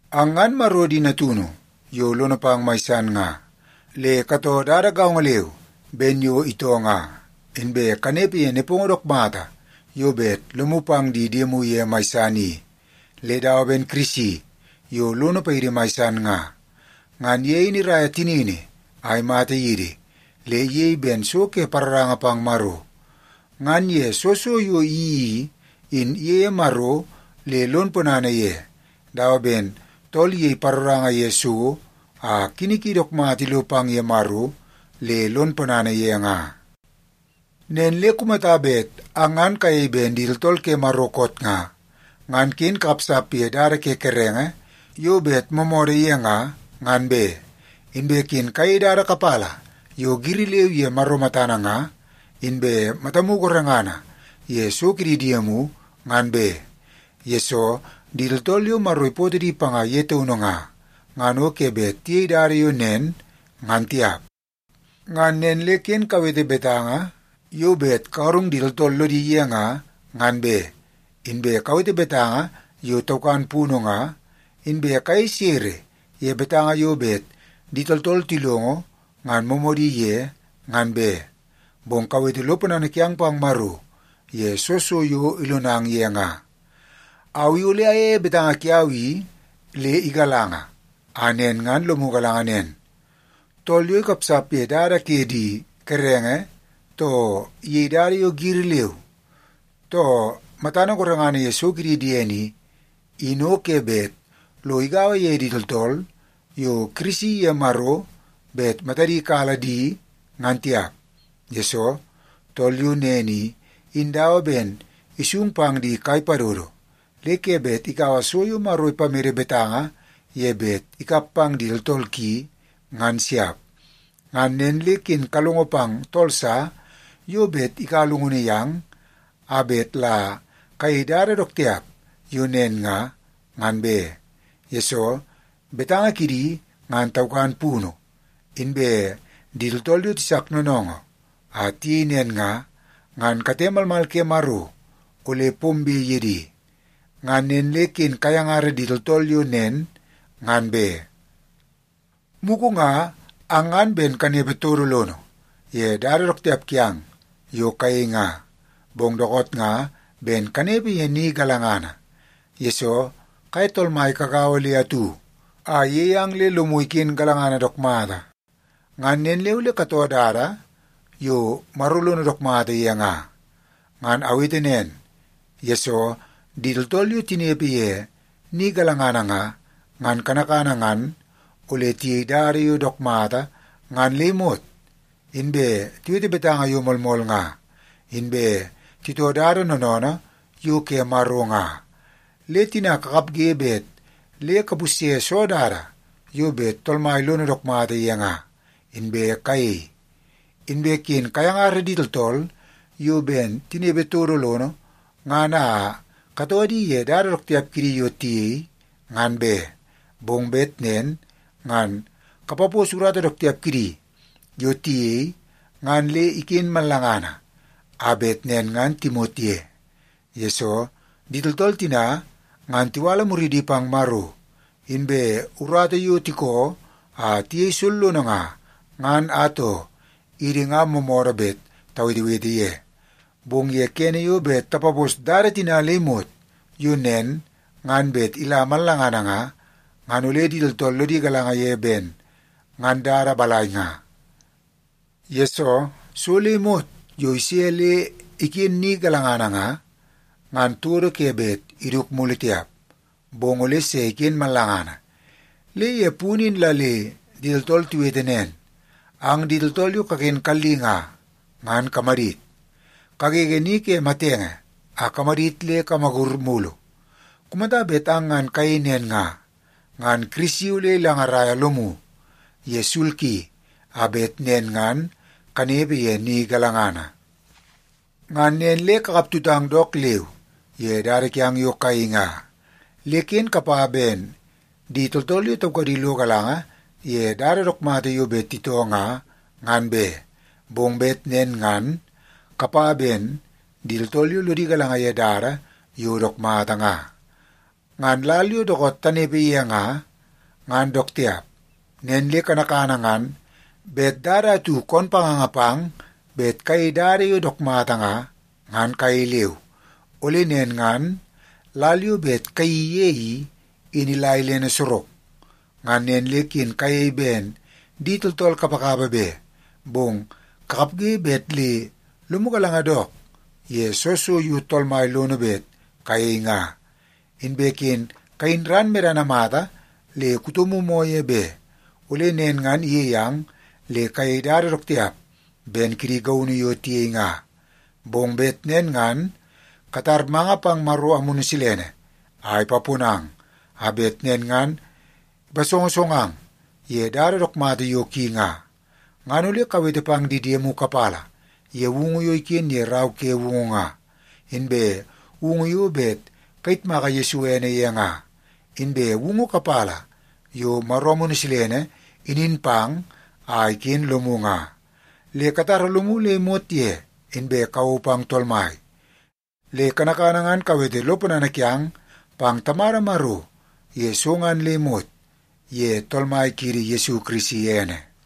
Ang ngan Maro di natunu yo lono pang mai san nga, le katoo dada gaongo leu ben yo itoo nga. Inbe kanepe ye nepongo dook mata yo bet lomu pang di diemu ye mai san i, le dawa ben Kirisi yo lono paidi mai san nga. Ngan ye in iraia tinini a imata yidi, le iyei ben so ke paroranga pang Maro. Ngan ye soo so yo iyeii i, in iyeie Maro le lon ponana ye, dawa ben tool iyei paroranga ye so a kini ki dook mata ilo pang ye Maro le lon ponana ye nga. Nen le kumata bet ang ngan kayei ben di tooltool ke Maro koot nga, ngan ken kakapsap ye dada ke kerenge yo bet moomoodoo ye nga, ngan be. Inbe ken kayei dada kapala yo giri leu ye Maro matana nga, inbe matamu gorengana ye so ke di diemu ngan be, yesoo di tooltool yo Maro ipootoo di panga ye taunu nga, ngan o ke bet tiyei dada yo nen, ngan tiap. Ngan nen le ken kawete betanga yo bet kagarung di tooltool lodi ye nga, ngan be. Inbe kawete betanga yo taukan punu nga, inbe kayei sere ye betanga yo bet di tooltool tilongo ngan moomoodi ye, ngan be. Bong kawete lo ponana kiang pang Maro ye soo so yo ilonang ye nga. Au i ole ayeie betanga kiau i le igalanga, a nen ngan lomu galanga nen: Tool yo ikapsap ye dada ke di kerenge, too iyei dada yo giri leu, too matana gorengana ye so kidi diene i, in o ke bet lo igaua ye di tooltool yo Kirisi iye Maro bet matadi kala di, ngan tiap. Yesoo, tool yo nen i, in dawa ben isung pang di kai padodo, le ke bet ikaua so yo Maro ipamede betanga ye bet ikap pang di tooltool ki, ngan siap. Ngan nen le ken kalongo pang tool sa yo bet ikaua llungunu yang a bet la kayei dada dook tiap yo nen nga, ngan be. Yesoo, betanga kidi ngan taukan punu, inbe di tooltool yo tisak noonoongoo a tiyei nen nga, ngan kate malmal ke Maro ole pombe ye di. Ngan nen le ken kayangara di tooltool yo nen, ngan be. Mugu nga ang ngan ben kanepe todo lono ye dada dook tiap kiang yo kayei nga, bong dookoot nga ben kanepe ye ni galangana, yesoo kaye Tool Mai kagaua le atu a iyei ang le lomu iken galangana dook mata. Ngan nen le ole katoo dada yo Maro lono dook mata ye nga. Ngan awete nen, yesoo di tooltool yo tinepe ye ni galangana nga, ngan kanakana ngan ole tiyei dada yo dook mata ngan le imot, inbe tiwete betanga yo moolmool nga, inbe titoo dada noonoonoo yo ke Maro nga. Le tina kakapge bet le kapusye soo dada yo bet Tool Mai lono dook mata ye nga, inbe kayei. Inbe ken kayangara di tooltool yo ben tinepe todo lono ngan a katoo di ye dada dook tiap kidi yo tiyei, ngan be. Bong bet nen ngan kapapos urata dook tiap kidi yo tiyei ngan le iken mallangana, a bet nen ngan timot ye. Yesoo, di tooltool tina ngan tiwala muridi pang Maro, inbe urata yo tiko a tiyei sollono nga, ngan atoo, idi nga moomoodoo bet tawetewete ye. Bong ye kene yo bet tapapos dada tina le imot yo nen ngan bet ila mallangana nga, ngan ole di tooltool lodi galanga ye ben ngan dada balai nga. Yesoo, so le imot yo ise le iken ni galangana nga, ngan todo ke bet iduku mulu tiap, bong ole se iken mallangana. Le ye punu in la le di tooltool tiwete nen: “Ang di tooltool yo kaken kalli nga, ngan kamadit! Kagege ni ke matenge a kamadit le kamagur mulu. Kumata bet ang ngan kayei nen nga, ngan Kirisi ole ilangarai lomu ye sul ki, a bet nen ngan kanepe ye ni galangana.” Ngan nen le kakap tutang dook leu ye dada kiang yo kayei nga, le ken kapa ben di tooltool yo taukadi lo galanga ye dada dook mata yo bet titoo nga, ngan be. Bong bet nen ngan kapa ben di tooltool yo lodi galanga ye dada yo dook mata nga. Ngan lal yo dookoot tanepe ye nga, ngan dook tiap. Nen le kanakana ngan bet dada atu koon panganga pang bet kayei dada yo dook mata nga, ngan kayei leu, ole nen ngan lal yo bet kayeii ye i, in ila ilene sorok. Ngan nen le ken kayei ben di tooltool kapakapa be, bong kakapge bet le lomu galanga dook ye soo so yo Tool Mai lono bet kayei nga. Inbe ken kayin ran medana mata le kutomu moo ye be, ole nen ngan iyei ang le kayei dada dook tiap ben kidi gaunu yo tiyei nga. Bong bet nen ngan katar manga pang Maro Amunu Silene a ipaponang, a bet nen ngan ipasongosongang ye dada dook mata yo ki nga. Ngan ole kawete pang di diemu kapala ye woungu yo iken ye Rau ke Woungu nga, inbe woungu yo bet kayitmaka Yesu ene ye nga, inbe woungu kapala yo Maro Amunu Silene inin pang a iken lomu nga. Le katara lomu le imot ye, inbe kawou pang Tool Mai. Le kanakana ngan kawete lo ponana kiang pang Tamada Maro ye so ngan le imot ye Tool Mai kiidi Yesu Kirisi ene.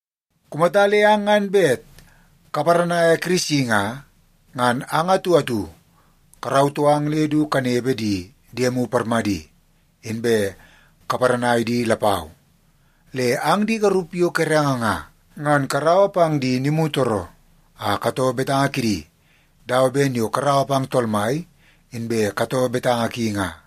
Kumata le ang ngan bet kaparanaia Kirisi nga, ngan ang atu atu karautoo ang le du kanepe di diemu parmadi, inbe kaparanai di lapau. Le ang di garup yo kerenge nga, ngan karaua pang di nimutooroo a katoo betanga kidi dawa ben yo karaua pang Tool Mai, inbe katoo betanga ki nga.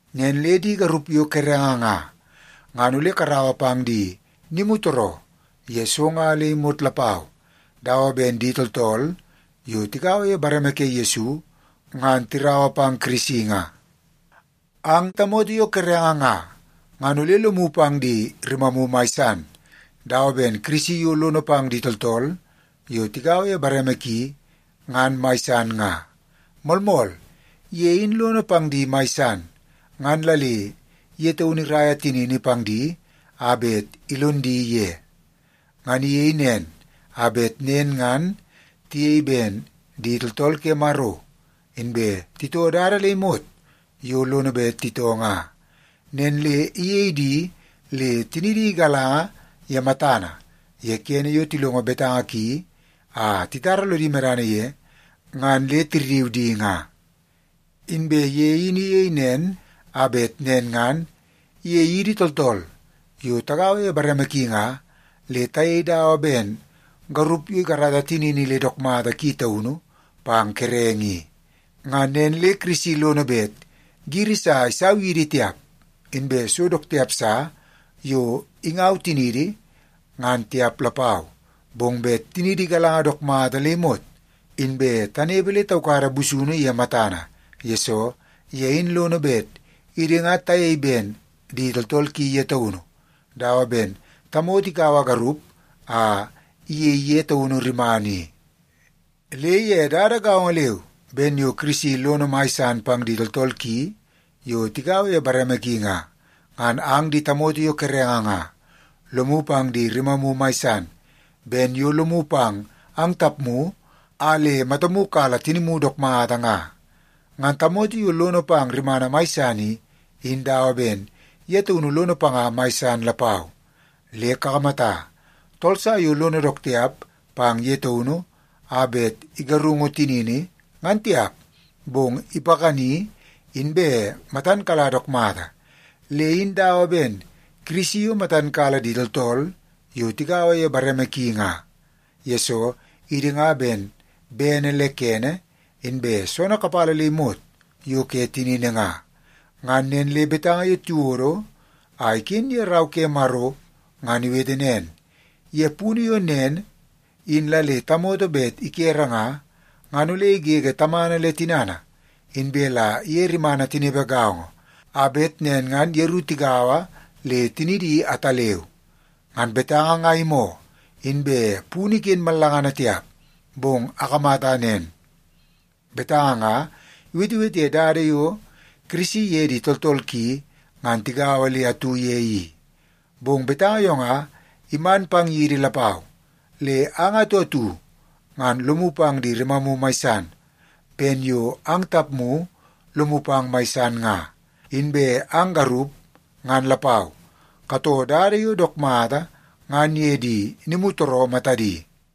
Nen le di garup yo kerenge nga, ngan ole karaua pang di nimutooroo ye so nga le imot lapau, dawa ben di tooltool yo tigaua ye bareme ke Yesu ngan tiraua pang Kirisi nga. Ang tamoto yo kerenge nga, ngan ole lomu pang di rimamu mai san, dawa ben Kirisi yo lono pang di tooltool yo tigaua ye bareme ki ngan mai san nga. Moolmool, ye in lono pang di mai san, ngan la le ye taunu iraia tinini pang di a bet ilon di ye. Ngan iyei nen, a bet nen ngan tiyei ben di tooltool ke Maro, inbe titoo dada le imot yo lono bet titoo nga. Nen le iyei di le tinidi igalanga ye matana ye kene yo tilongo betanga ki a titara lodi medana ye ngan le tirriu di nga. Inbe ye in iyei nen, a bet nen ngan iyei idi tooltool yo tagaua ye bareme ki nga, le tayei dawa ben garup yo ikarata tinini le dook mata ki taunu pang kerenge i. Ngan nen le Kirisi lono bet giri sa isau yidi tiap, inbe so dook tiap sa yo ingaua tiniidi ngan tiap lapau, bong bet tiniidi igalanga dook mata le imot, inbe tanepe le taukada busunu ye matana, yesoo ye in lono bet idi nga tayei ben di tooltool ki ye taunu, dawa ben tamoto ikaua garup a iyei ye taunu rimana i. Le ye dada gaongo leu ben yo Kirisi lono mai san pang di tooltool ki yo tigaua ye bareme ki nga, ngan ang di tamoto yo kerenge nga, lomu pang di rimamu mai san, ben yo lomu pang ang tapmu a le matamu kala tinimu dook mata nga. Ngan tamoto yo lono pang rimana mai san i, in dawa ben ye taunu lono panga mai san lapau. Le kakamata, tool sa yo lono dook tiap pang ye taunu a bet igarungu tinini, ngan tiap, bong ipakani inbe matan kala dook mata. Le in dawa ben Kirisi yo matan kala di tooltool yo tigaua ye bareme ki nga, yesoo idi nga ben bene le kene inbe soonoo kapala le imot yo ke tinini nga. Ngan nen le betanga yo tiwodo a iken ye Rau ke Maro ngan iwete nen, “Ye punu yo nen in la le tamoto bet ikere nga, ngan ole igege tamana le tinana, inbe la iye rimana tinepe gaongo, a bet nen ngan yeru tigaua le tinidi ataleu.” Ngan betanga nga imoo, inbe punu iken mallangana tiap, bong akamata nen; betanga nga iwetewete ye dada yo Kirisi iye di tooltool ki ngan tigaua le atu ye i. Bong betanga yo nga iman pang yidi lapau. Le ang atu atu ngan lomu pang di rimamu mai san, ben yo ang tapmu lomu pang mai san nga. Inbe ang garup ngan lapau, katoo dada yo dook mata ngan ye di nimutooroo matadi.